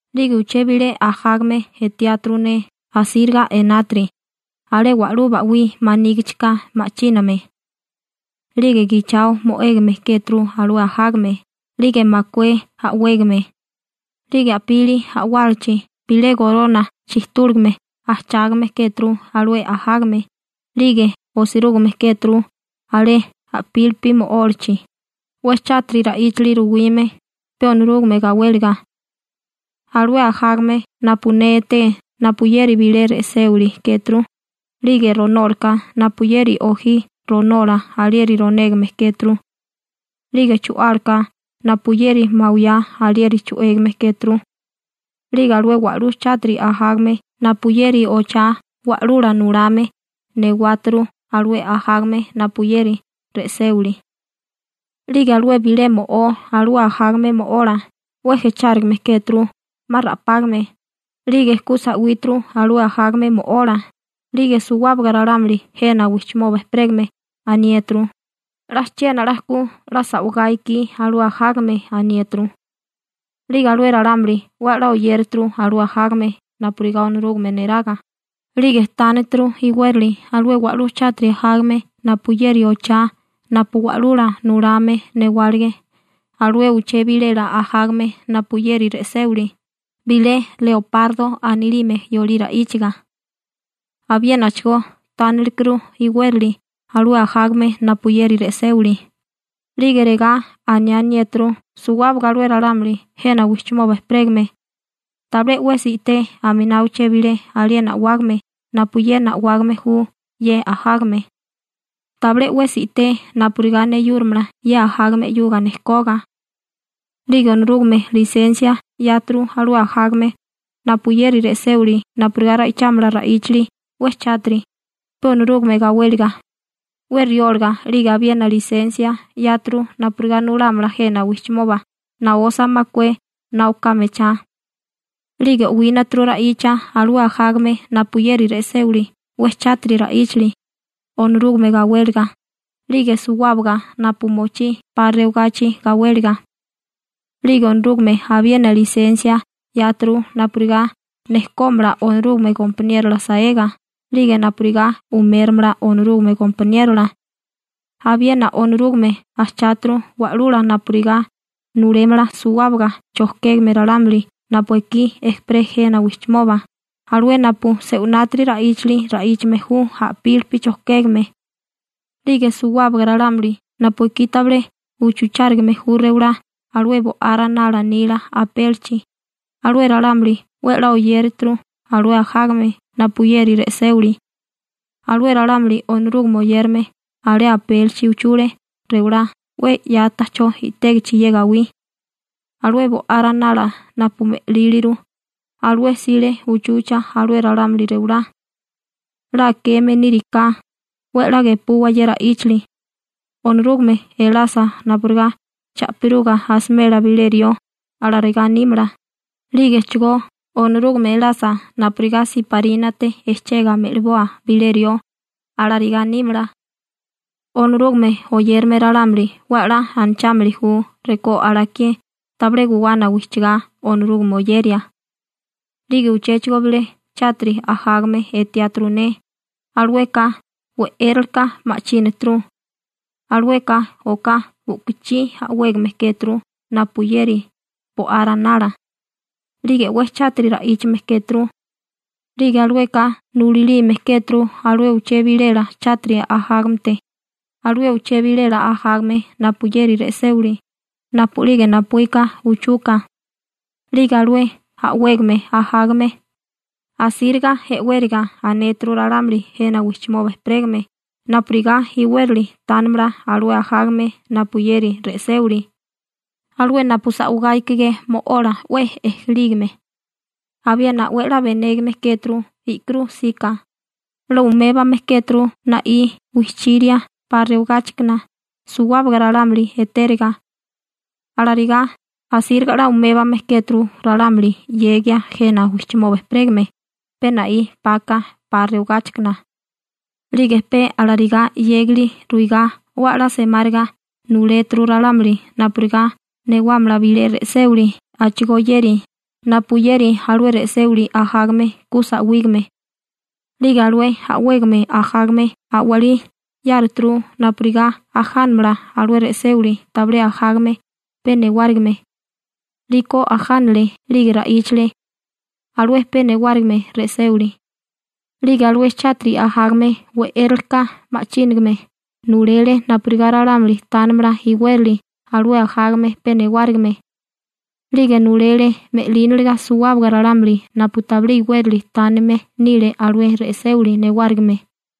'Lige uché bilé ajágame etiáturu ne asíriga enátiri alé wa'lú ba'wí manígichika ma'chíname. 'Lige gichao mo'égame kéturu alué ajágame 'lige makué a'wégame, 'lige a'pili a'wálachi bilé gorona chijtúligame ajchágame kéturu alué ajágame, 'lige osirúgime kéturu alé a'pílipi mo'ólachi, 'we chátiri ra'íchali ruwime, pe Onorúgame gawéliga. Alué ajágame napu ne eté napuyeri bilé re'séwili kéturu, 'lige ronólaká napuyeri ojí ronola alieri ronégame kéturu, 'lige chu'álaka napuyeri mawiyá alieri chu'égame kéturu. 'Lige alué wa'lú chátiri ajágame napuyeri ochá wa'lula nulame newáturu alué ajágame napuyeri re'séwili. 'Lige alué bilé mo'ó alué ajágame mo'ola 'we jechárigame kéturu 'ma ra'págame 'lige ku sa'wíturu alué ajágame mo'ola, 'lige suwábaga ralámuli jena wijchimoba ejperégame aniéturu: ―'La chiena 'la ku 'la sa'wigá ikí alué ajágame ―aniéturu. 'Lige alué ralámuli 'we 'la oyératuru alué ajágame napurigá Onorúgame neraga, 'lige tánituru iwérali alué wa'lú chátiri ajágame napuyeri ochá napu wa'lula nulame newálige alué uché bilela ajágame napuyeri re'séwili («leopardo» anilime yolí ra'íchaga). Abiénachigó tánituru iwérali alué ajágame napuyeri re'séwili. 'Lige regá aniániéturu suwábaga alué ralámuli jena wijchimoba ejperégame: ―Tabilé 'wesi i'té aminá uché bilé aliena a'wágame napuyena a'wágame ju ye ajágame. Tabilé 'wesi i'té napurigá neyúrimala ye ajágame 'yuga nejkoga. 'Lige Onorúgame lisensia 'yáturu alué ajágame napuyeri re'séwili napurigá ra'ichámala ra'íchali 'we chátiri, pe Onorúgame gawéliga, 'we rióliga. 'Lige abiena lisensia 'yáturu napurigá nulámala jena wijchimoba naosa makué na oká mechá. 'Lige o'wínaturu ra'icha alué ajágame napuyeri re'séwili 'we chátiri ra'íchali, Onorúgame gawéliga, 'lige suwábaga napu mochí 'pa rewagachi gawéliga. 'Lige Onorúgame abiena lisensia 'yáturu napurigá nejkómala Onorúgame gompaniérola saega 'lige napurigá umérimala Onorúgame gompaniérola. Abiena Onorúgame ajcháturu wa'lula napurigá nulémala suwábaga chojkégame ralámuli napu ekí ejperé jena wijchimoba, alué napu se'winati ra'íchali ra'íchame ju a'pílipi chojkégame. 'Lige suwábaga ralámuli napu ekí tabilé uchuchárigame ju rewalá alué Bo'á Ranala nila apélichi, alué ralámuli 'we 'la oyérituru alué ajágame napuyeri re'séwili. Alué ralámuli Onorúgame oyérame alé apélichi uchule rewalá 'we 'ya ta'chó i'tégichi ye gawí. Alué Bo'á Ranala napu me'líliru, alué 'sile uchucha alué ralámuli rewalá. 'La akeme níriká, 'we 'la gepuwa ye ra'íchali. Onorúgame elasa napurigá cha'piruga asimela bilé rió, alarigá nímala, 'lígechigó Onorúgame elasa napurigá siparínate ejchega me'liboa bilé rió, alarigá nímala. Onorúgame oyérame ralámuli 'we 'la anachámili ju rekó alakié tabilé guwana wijchigá Onorúgame oyeria. 'Lige uchéchigo bilé chátiri ajágame etiáturu ne, alueka we'éreleka ma'chínaturu. Alueka oká u'kuchí a'wégame kéturu napuyeri bo'á ranala, 'lige 'we chátiri ra'íchame kéturu 'lige alueka nulalime kéturu alué uché bilela chátiri ajágamete, alué uché bilela ajágame napuyeri re'séwili, napu'lige napuíka uchuka. 'Lige alué a'wégame ajágame, asíriga e'wériga anéturu ralámuli jena wijchimoba ejperégame napurigá iwérali tánimala alué ajágame napuyeri re'séwili, alué napu sa'wigá ikigé mo'ola 'we ejelígame. Abiena 'we 'la benégame kéturu i'kirú 'sika, 'la umébame kéturu na'í wijchiria 'pa rewagáchikana suwábaga ralámuli etériga. Alarigá, asíriga 'la umébame kéturu ralámuli 'yegia jena wijchimoba ejperégame, pe na'í 'paka 'pa rewagáchikana. 'Lige pe alarigá 'yégali ruigá 'we 'la semáriga nuléturu ralámuli napurigá newámala bilé re'séwili a'chigóyéri napuyeri alué re'séwili ajágame ku sa'wígame. 'Lige alué a'wégame ajágame a'walí 'yáruturu napurigá ajánamala alué re'séwili tabilé ajágame pe newárigime. 'Liko ajánale 'lige ra'íchale alué pe newárigime re'séwili. 'Lige alué chátiri ajágame we'éraleka ma'chínagame nulele napurigá ralámuli tánimala iwérali alué ajágame pe newárigime. 'Lige nulele me'líniliga suwábaga ralámuli napu tabilé iwérali tánime nile alué re'séwili newárigime.